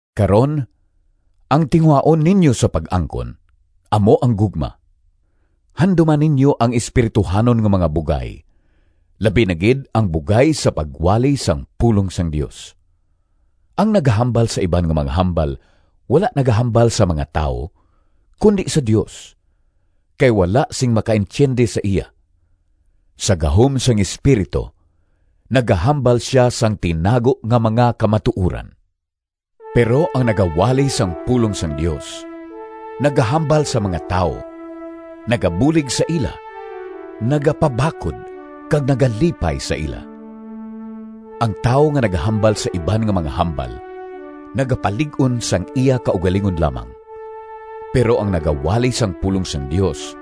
Karon, ang tinguhaon ninyo sa pag-angkon amo ang gugma. Handuma ninyo ang espirituhanon nga mga bugay, labi na gid ang bugay sa pagwali sang pulong sang Dios. Ang nagahambal sa iban nga mga hambal wala nagahambal sa mga tawo, kundi sa Dios, kay wala sing makaintiyendi sa iya. Sa gahom sang Espiritu nagahambal sia sang tinago nga mga kamatuoran. Pero ang nagawali sang pulong sang Dios nagahambal sa mga tawo, nagabulig sa ila, nagapabakod kag nagalipay sa ila. Ang tawo nga nagahambal sa iban nga mga hambal nagapalig-on sang iya kaugalingon lamang, pero ang nagawali sang pulong sang Dios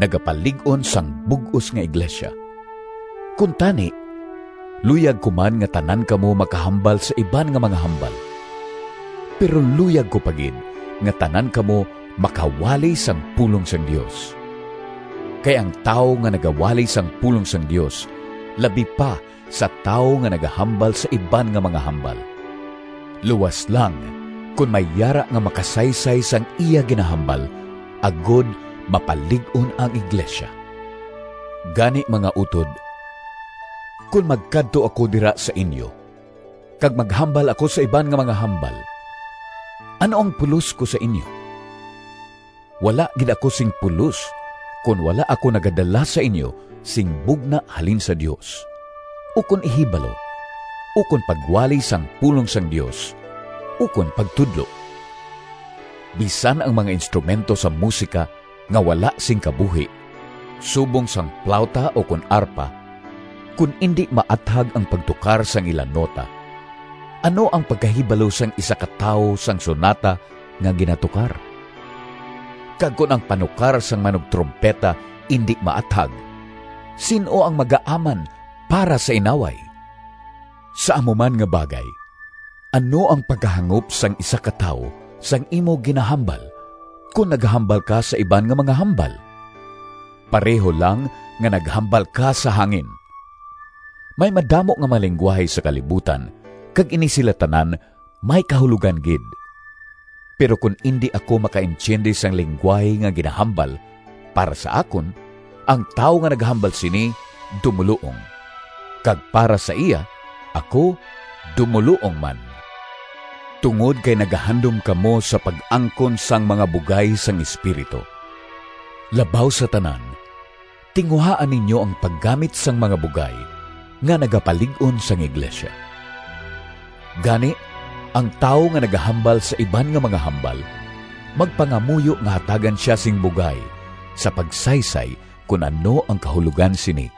nagapalig-on sang bug-os nga iglesia. Kuntani, luyag ko man nga tanan kamo makahambal sa iban nga mga hambal, pero luyag ko pa gid nga tanan kamo makawali sang pulong sang Dios. Kay ang tawo nga nagawali sang pulong sang Dios labi pa sa tawo nga nagahambal sa iban nga mga hambal, luas lang kon may yara nga makasaysay sang iya ginahambal, agod mapalig-on ang iglesia. Gani, mga utod, kon magkadto ako dira sa inyo kag maghambal ako sa iban nga mga hambal, ano ang pulos ko sa inyo? Wala gid ako sing pulos kon wala ako nagadala sa inyo sing bugna halin sa Dios, ukon ihibalo, ukon pagwali sang pulong sang Dios, ukon pagtudlo. Bisan ang mga instrumento sa musika nga wala sing kabuhi, subong sang plawta ukon arpa, kon indi maathag ang pagtukar sang ila nota, ano ang pagkahibalo sang isa ka tawo sang sonata nga ginatukar? Kag kon ang panukar sang manugtrumpeta indi maathag, sin-o ang magaaman para sa inaway? Sa amo man nga bagay, ano ang pagkahangop sang isa ka tawo sang imo ginahambal kon nagahambal ka sa iban nga mga hambal? Pareho lang nga naghambal ka sa hangin! May madamo nga mga linggwahe sa kalibutan kag ini sila tanan may kahulogan gid. Pero kon indi ako makaintiyendi sang linggwahe nga ginahambal, para sa akon, ang tawo nga nagahambal sini dumoluong, kag para sa iya ako dumoluong man. Tungod kay nagahandom kamo sa pag-angkon sang mga bugay sang Espiritu, labaw sa tanan tinguhaa ninyo ang paggamit sang mga bugay nga nagapalig-on sang iglesia. Gani, ang tawo nga nagahambal sa iban nga mga hambal, magpangamuyo nga hatagan sia sing bugay sa pagsaysay kon ano ang kahulogan sini.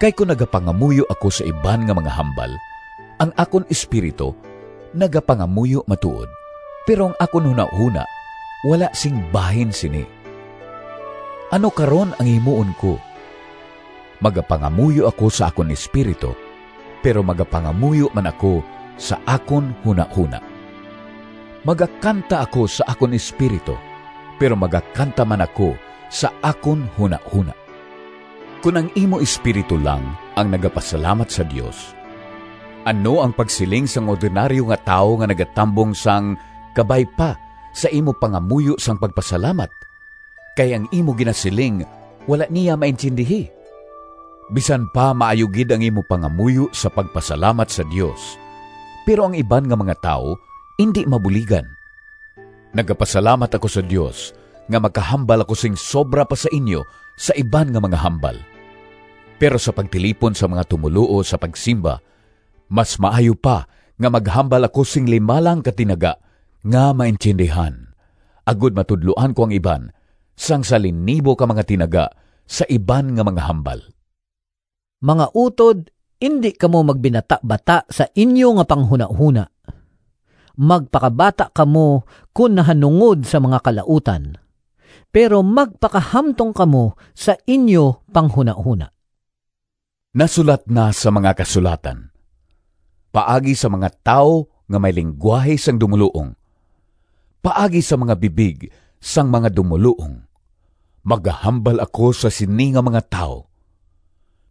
Kay kon nagapangamuyo ako sa iban nga mga hambal, ang akon espiritu nagapangamuyo matuod, pero ang akon hunahona wala sing bahin sini. Ano karon ang himuon ko? Magapangamuyo ako sa akon espiritu, pero magapangamuyo man ako sa akon hunahona. Magakanta ako sa akon espiritu, pero magakanta man ako sa akon hunahona. Kon ang imo espiritu lang ang nagapasalamat sa Dios, ano ang pagsiling sang ordinaryo nga tawo nga nagatambong sang “Kabay pa” sa imo pangamuyo sang pagpasalamat, kay ang imo ginasiling wala niya maintiyendihi? Bisan pa maayo gid ang imo pangamuyo sa pagpasalamat sa Dios, pero ang iban nga mga tawo indi mabuligan. Nagapasalamat ako sa Dios nga makahambal ako sing sobra pa sa inyo sa iban nga mga hambal. Pero sa pagtilipon sang mga tumoluo sa pagsimba mas maayo pa nga maghambal ako sing lima lang ka tinaga nga maintiyendihan, agod matudloan ko ang iban, sang sa linibo ka mga tinaga sa iban nga mga hambal. Mga utod, indi kamo magbinatabata sa inyo nga panghunahona. Magpakabata kamo kon nahanungod sa mga kalautan, pero magpakahamtong kamo sa inyo panghunahona. Nasulat na sa mga Kasulatan: “Paagi sa mga tawo Nga may linggwahe sang dumoluong, Paagi sa mga bibig Sang mga dumoluong Magahambal ako sa sini nga mga tawo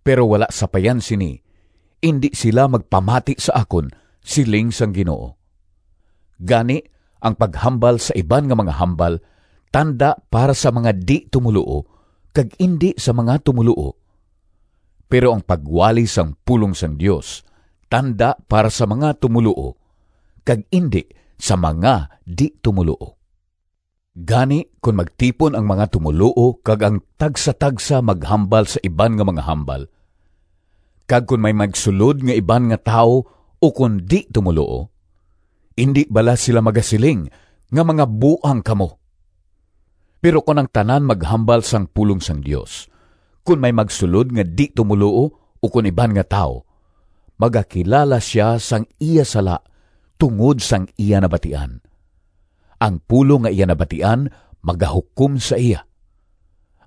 Pero, wala sapayan sini, Indi sila magpamati sa akon, Siling sang Ginoo.” Gani, ang paghambal sa iban nga mga hambal tanda para sa mga di-tumoluo kag indi sa mga tumoluo, pero ang pagwali sang pulong sang Dios tanda para sa mga tumoluo, kag indi sa mga di-tumoluo. Gani, kon magtipon ang mga tumoluo kag ang tagsatagsa maghambal sa iban nga mga hambal, kag kon may magsulod nga iban nga tawo ukon di-tumoluo, indi bala sila magasiling nga mga buang kamo? Pero kon ang tanan maghambal sang pulong sang Dios, kon may magsulod nga di-tumoluo ukon iban nga tawo, magakilala sia sang iya sala tungod sang iya nabatian. Ang pulong nga iya nabatian magahukom sa iya,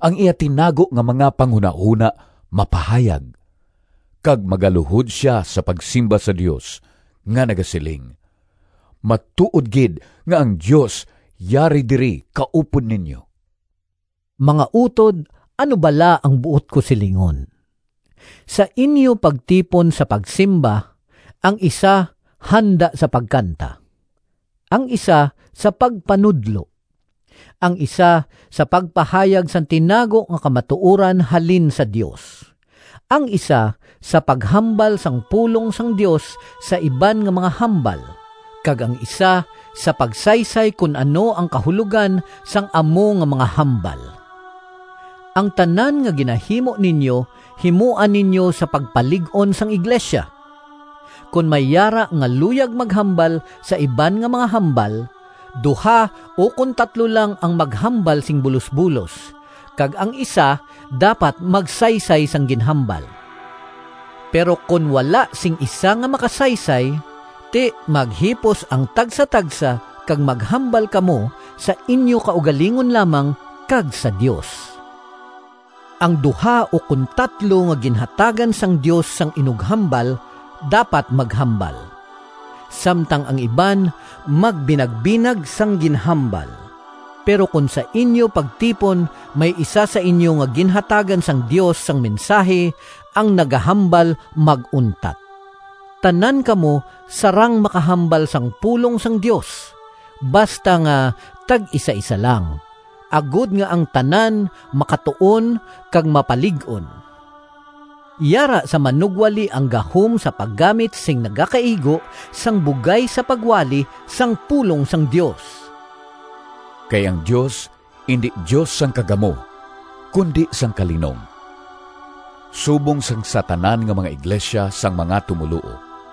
ang iya tinago nga mga panghunahona mapahayag, kag magaluhod sia sa pagsimba sa Dios nga nagasiling, “Matuod gid nga ang Dios yari diri kaupod ninyo!” Mga utod, ano bala ang buot ko silingon? Sa inyo pagtipon sa pagsimba, ang isa handa sa pagkanta, ang isa sa pagpanudlo, ang isa sa pagpahayag sang tinago nga kamatuoran halin sa Dios, ang isa sa paghambal sang pulong sang Dios sa iban nga mga hambal, kag ang isa sa pagsaysay kon ano ang kahulogan sang amo nga mga hambal. Ang tanan nga ginahimo ninyo, himoa ninyo sa pagpalig-on sang iglesia. Kon may yara nga luyag maghambal sa iban nga mga hambal, duha ukon tatlo lang ang maghambal sing bulosbulos, kag ang isa dapat magsaysay sang ginhambal. Pero kon wala sing isa nga makasaysay, ti, maghipos ang tagsatagsa kag maghambal kamo sa inyo kaugalingon lamang kag sa Dios. Ang duha ukon tatlo nga ginhatagan sang Dios sang inughambal dapat maghambal, samtang ang iban magbinagbinag sang ginhambal. Pero kon sa inyo pagtipon may isa sa inyo nga ginhatagan sang Dios sang mensahi, ang nagahambal mag-untat. Tanan kamo sarang makahambal sang pulong sang Dios, basta nga tag-isaisa lang, agod nga ang tanan makatuon kag mapalig-on. Yara sa manugwali ang gahom sa paggamit sing nagakaigo sang bugay sa pagwali sang pulong sang Dios. Kay ang Dios indi Dios sang kagamo, kundi sang kalinong. Subong sang sa tanan nga mga iglesia sang mga tumoluo,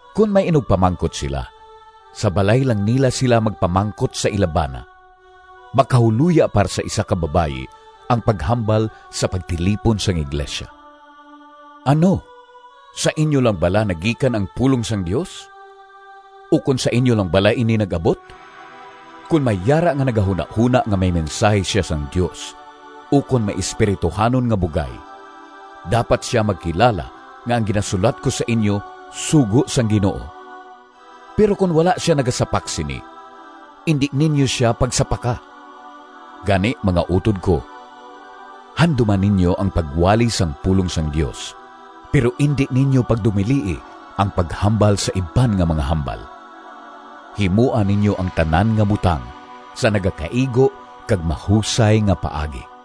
Kon may inugpamangkot sila, sa balay lang nila sila magpamangkot sa ila bana. Makahuloya para sa isa ka babayi ang paghambal sa pagtilipon sang iglesia. Ano, sa inyo lang bala nagikan ang pulong sang Dios? Ukon sa inyo lang bala ini nag-abot? Kon may yara nga nagahunahona nga may mensahi sia sang Dios ukon may espirituhanon nga bugay, dapat sia magkilala nga ang ginasulat ko sa inyo sugo sang Ginoo. Pero kon wala sia nagasapak sini, indi ninyo sia pagsapaka. Gani, mga utod ko, handuma ninyo ang pagwali sang pulong sang Dios, pero indi ninyo pagdumilii ang paghambal sa iban nga mga hambal. Himoa ninyo ang tanan nga butang sa nagakaigo kag mahusay nga paagi.